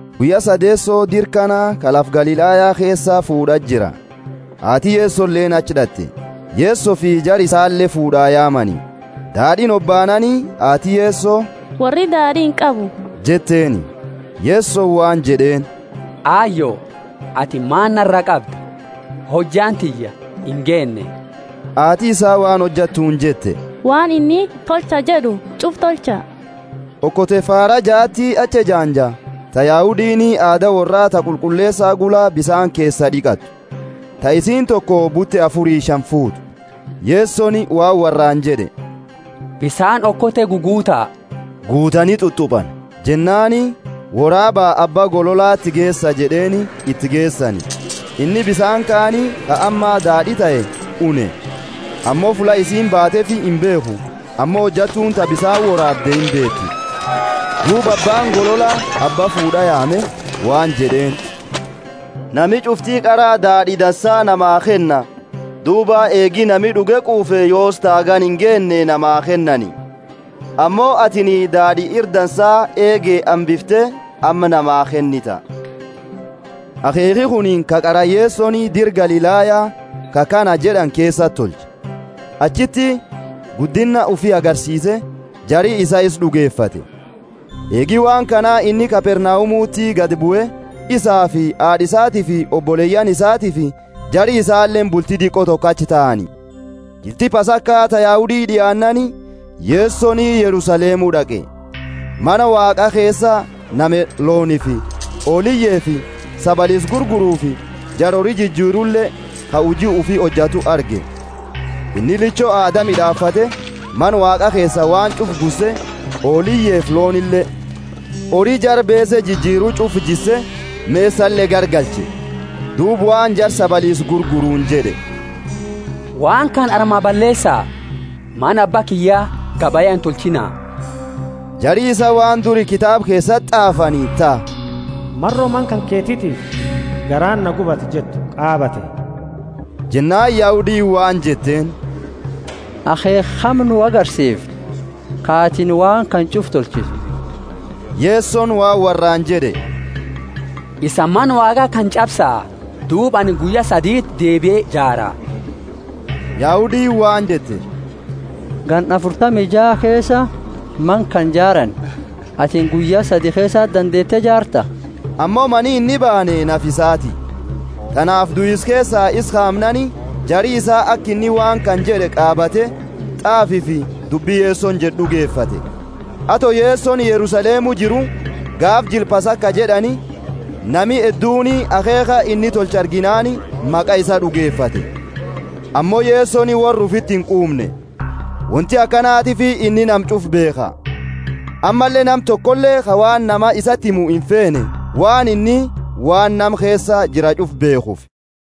Guyya sadeeso dira kana, ka lafa Galilaya keesa, fuud'a jira. Haati Yesoleeni achi d'at'e. Yesofi jara isale fuud'aa yaamani. Daad'iini hobaanaani, haati Yeso, Worri daad'i inqabu jetteeni. Yesoni waan jed'eeni, Ayo, atini maani nara qabda? Hojjaani tiyya ingeenne. Haati isaa waan hojattuuni jette, Waan inni, Tolcha jed'u ch'ufa tolcha. Okote faara jaati achi ejaanja, ta Yahudiini aada worra ta qulqulleesa gula, bisaani keesa d'iqatu; ta isiini toko bute afuri shani fuutu. Yesoni waan worraani jed'e, Bisaani okote guguuta. Guutani t'ut'upani. Jennaani, Woraaba, abba gololati geesa jed'eeni. Iti geesani. Inni bisaani kaani, ka amma daad'i tahe, une, ammo fulla isiini baateefi imbeekhu (ammo hojattuuni ta bisaani woraabde imbeeti). Duuba abbaani golola abba fuud'a yaame waan jed'eeni, Nami ch'ufti qara daad'i dansa namaa kenna, duuba eegi nami d'uge quufe yoosi ta hagana ingeenne namaa kennani. Ammo atini daad'i ira dansa eege hambifte amma namaa kennita. Akheekhi kuni ka qara Yesoni, dira lafa Galilaya, ka kana jed'ani keesati tolche. Achiti guddinna ufi agarsiise, jari isaa isa d'ugefate. Eegi waan kana inni Kapernaumuti gadi bue, isaafi haad'a isaatiifi oboleyaani isaatiifi jari isaaleeni bulti diqo toko achi taani. Jilti Pasaka ta Yahudi d'iaannaani, Yesoni Yerusalemu d'aqe. Mana Waaqa keesa nama loonifi hooliyefi sabaliisa gurgurufi, jara hori jijirule, ka huji ufi hojatu arge. Inni licho haada mid'aafate, Mana Waaqa keesaa waan ch'ufa gusse hooliyefi loonile, hori jara beese jijiru ch'ufa jisse, mesale garagalche. Duuba waan jara sabaliisa gurguruuni jed'e, Waan kana armaa balleesa, Mana Abba kiyya gabaya intolchiina. Jari isaa waan duri kitaaba keesati t'aafani, ta, Maro mana kanketitiifi garaani na gubata jettu qaabate. Jennaani Yahudiini waan jetteeni, Akheekha kami nu agarsiifta, ka atini waan kana ch'ufa tolchitu? Yesoni waan worraani jed'e, Isani Mana Waaqa kana ch'absa, duuba anini guyya saditi deebie jaara. Yahudiini waan jette, Ganna afurtami jaa keesa Mana kana jaarani, atini guyya sadi keesati dandeete jaarta? Ammo mani inni baane nafa isaati. Tanaafi duisa keesaa isa kaamnaani, jari isaa aka inni waan kana jed'e qaabate, t'aafifi dubbi Yesoni jed'e d'ugefate. Ato Yesoni Yerusalemu jiru, gaafa Jila Pasaka jed'ani, nami hedduuni akheekha inni tolche arginaani, maqa isaa d'ugefate. Ammo Yesoni worra ufiti inquumne; wonti akanatiifi inni nama ch'ufa beekha, ammalle nama tokole ka waan namaa isati himu imfeene, waan inni waan nama keesa jira ch'ufa beekhufi.